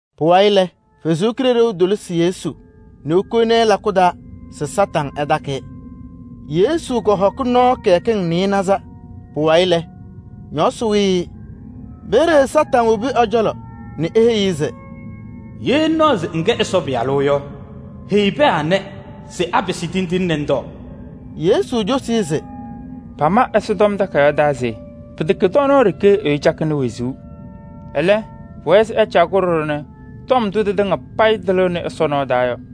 Pʋwayɩ lɛ, Ɛsɔ Kalɩzaɣ tolisi Yesu nɛ kowoni-i lakʋ taa se Kañadʋ Satanɩ ɛtakɩ-ɩ. Yesu kɔhɔkɩ nɔɔ kɩyakɩŋ nɩɩnaza. Pʋwayɩ lɛ, ñɔɔsɩ kpa-ɩ. Peeye Kañadʋ Satanɩ wobi ɛ-cɔlɔ nɛ eheyi-i se: “Ye ŋnaɣ se ŋkɛ Ɛsɔ Pɩyalʋ yɔ, heyi pɛɛ anɛ se apɩsɩ tindine nɛ ŋtɔɔ.” Yesu cosi-i se: “Pama Ɛsɔtɔm Takayaɣ taa se: ‘Pɩtɛkɛ tɔɔnaɣ ɖeke ɛyʋ cakɩnɩ wezuu. Ɛlɛ, pʋwɛɛ se ɛcaɣ-kʋ ɖɔɖɔ nɛ tɔm ndʋ tɩtɩŋa payɩ tɩlɩɣnɩ Ɛsɔ nɔɔ taa yɔ.’”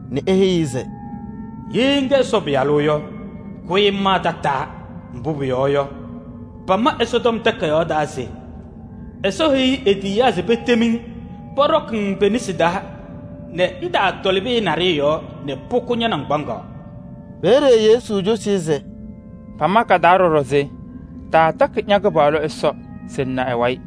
nɛ eheyi-i se: “Ye ŋkɛ Ɛsɔ Pɩyalʋ yɔ, kʋyɩ ŋmaa tataa. Mbʋ pʋyɔɔ yɔ, pama Ɛsɔtɔm Takayaɣ taa se ‘Ɛsɔ heyiɣ e-tiyiyaa se petem-ŋ pɔɖɔkɩ-ŋ pe-nesi taa nɛ ŋtaatɔlɩ pɩyɛ naɖɩyɛ yɔɔ nɛ pʋkʋ ña-naŋgbaŋaɣ.’” Peeye Yesu cosi-i se: “Pama ɖɔɖɔ ka-taa se: ‘Taatakɩ ña-Kɩpaɣlʋ Ɛsɔ se ŋna ɛ-wayɩ.’”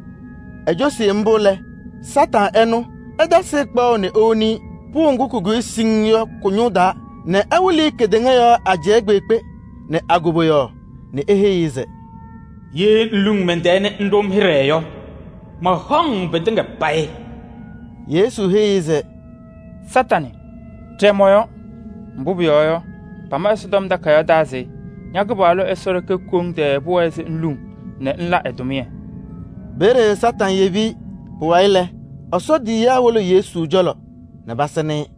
Ecosi mbʋ lɛ, Kañadʋ Satanɩ ɛnʋ ɛtasɩ-ɩ kpaɣʋ nɛ ewoni-i pʋʋ ŋgʋ kʋkʋyɩ siŋŋ yɔ kʋ-ñʋʋ taa nɛ ɛwɩlɩ-ɩ kedeŋa yɔɔ ajɛɛ kpeekpe nɛ a-koboyaɣ nɛ eheyi-i se: “Ye ŋluŋ mɛn-tɛɛ nɛ ŋɖʋ-m hɩɖɛ yɔ, mahaɣ-ŋ pɩtɩŋa payɩ.” Yesu heyi-i se: “Satanɩ ɖɛɛ mɔ-yɔɔ! Mbʋ pʋyɔɔ yɔ, pama Ɛsɔtɔm Takayaɣ taa se: ‘Ña-Kɩpaɣlʋ Ɛsɔ ɖeke koŋ tɛɛ pʋwɛɛ se ŋluŋ nɛ ŋla ɛ-tʋmɩyɛ.’” Peeye Kañadʋ Satanɩ yebi-i. Pʋwayɩ lɛ, Ɛsɔ tiyiyaa wolo Yesu cɔlɔ nɛ pasɩnɩ-ɩ.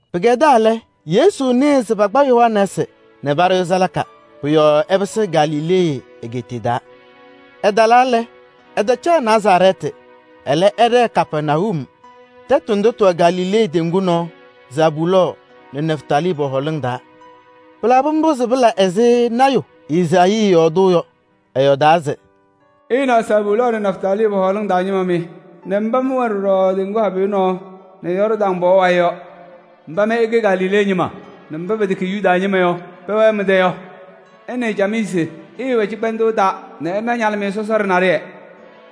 Pɩkɛdaa lɛ, Yesu nɩɩ se pakpa Yohanɛɛsɩ nɛ paɖʋ-ɩ salaka. Pʋ-yɔɔ ɛpɩsɩ Galilee egeetiye taa. Ɛtalaa lɛ, ɛtacaɣ Nazarɛɛtɩ. Ɛlɛ, ɛɖɛɛ Kapɛrnayum. Tɛtʋ ndʋ tɩwɛ Galilee teŋgu nɔɔ, Zabulɔɔ nɛ Nɛftalii pɔ-hɔɔlɩŋ taa. Pɩlabɩ mbʋ se pɩla ɛzɩ lɔɔyaɣ tʋ Ezaayii yɔɔdʋʋ yɔ. Ɛyɔɔdaa se: “Ɩnaɣ, Zabulɔɔ nɛ Nɛftalii pɔ-hɔɔlɩŋ taa ñɩma mɩ nɛ mba mɩ mɩwɛ ɖɔɖɔ teŋgu habɩyɛ nɔɔ nɛ Yɔɔrdaŋ pɔɔ wayɩ yɔ! Mba mɩ ɩkɛ Galilee ñɩma nɛ mba pɛtɛkɛ Yuda ñɩma yɔ pɛwɛɛ mɩ-tɛ yɔ! Ɩnɩɩ camɩyɛ se: ɩɩwɛ cɩkpɛndʋʋ taa nɛ ɩna ñalɩmɩyɛ sɔsɔɖɛ naɖɩyɛ!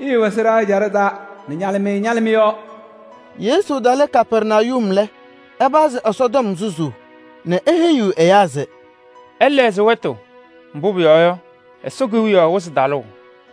Ɩɩwɛ sɩɖaa ɛjaɖɛ taa nɛ ñalɩmɩyɛ ñalɩ mɩ-yɔɔ.” Yesu talɩ Kapɛrnayum lɛ, ɛpazɩ Ɛsɔtɔm susuu nɛ eheyiɣ ɛyaa se: “Ɩlɛɣzɩ wɛtʋ, mbʋ pʋyɔɔ yɔ, Ɛsɔ Kewiyaɣ wɩzɩ talʋʋ!”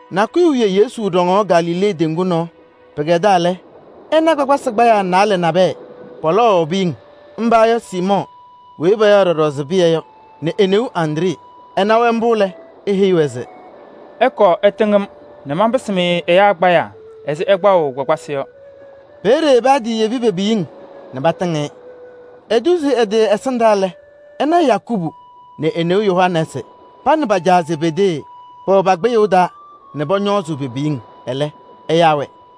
Nakʋyʋ wiye Yesu ɖɔŋaɣ Galilee teŋgu nɔɔ. Pɩkɛdaa lɛ, ɛna kpakpasɩ kpayaa naalɛ nabɛyɛ, pɔlɔwaɣ piyiŋ. Mba yɔ: Siimɔɔ weyi payaɣ ɖɔɖɔ se Pɩyɛ yɔ nɛ e-neu Andree. Ɛna-wɛ mbʋ lɛ, eheyi-wɛ se: “Ɩkɔɔ ɩtɩŋ-m nɛ manpɩsɩ-mɩ ɛyaa kpayaa ɛzɩ ɩkpaɣʋ kpakpasɩ yɔ.” Peeye patiyebi pe-piyiŋ nɛ patɩŋ-ɩ. Etuzi ɛ-tɩ ɛsɩndaa lɛ, ɛna Yakubu nɛ e-neu Yohanɛɛsɩ, pa nɛ pa-caa Zebedee pɛwɛ pa-kpɩyʋʋ taa nɛ pɔñɔɔzʋʋ pe-piyiŋ. Ɛlɛ, ɛyaa-wɛ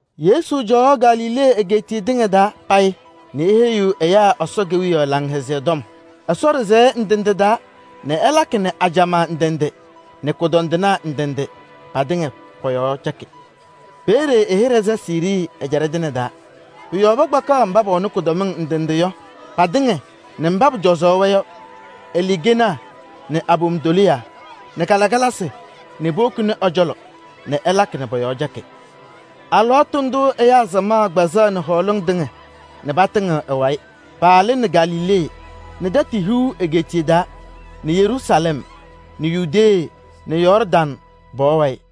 Yesu cɔwaɣ Galilee egeetiye tɩŋa taa payɩ nɛ eheyiɣ ɛyaa Ɛsɔ Kewiyaɣ Laŋhɛzɩyɛ Tɔm Ɛsɔ ɖɩsɛyɛ ndɩ ndɩ taa nɛ ɛlakɩ nɛ ajamaa ndɩ ndɩ nɛ kʋdɔndɩnaa ndɩ ndɩ patɩŋa pɔ-yɔɔ cɛkɩ. Peeye ɛ-hɩɖɛ sɛ Siirii ɛjaɖɛ tɩŋa taa. Pʋ-yɔɔ pakpakaɣ mba pɛwɛnɩ kʋdɔmɩŋ ndɩ ndɩ yɔ patɩŋa nɛ mba pʋcɔzʋʋ-wɛ yɔ: aluukenaa nɛ abom tɔlɩyaa nɛ kalɩkalasɩ nɛ powokini ɛ-cɔlɔ nɛ ɛlakɩ nɛ pɔ-yɔɔ cɛkɩ. Alɩwaatʋ ndʋʋ ɛyaa samaɣ kpɛzɩnɩ hɔɔlɩŋ tɩŋa nɛ patɩŋɩɣ ɛ-wayɩ. Paalɩnɩ Galilee nɛ Tɛtʋ Hiu egeetiye taa nɛ Yeruusalɛm nɛ Yudee nɛ Yɔɔrdaŋ pɔɔ wayɩ.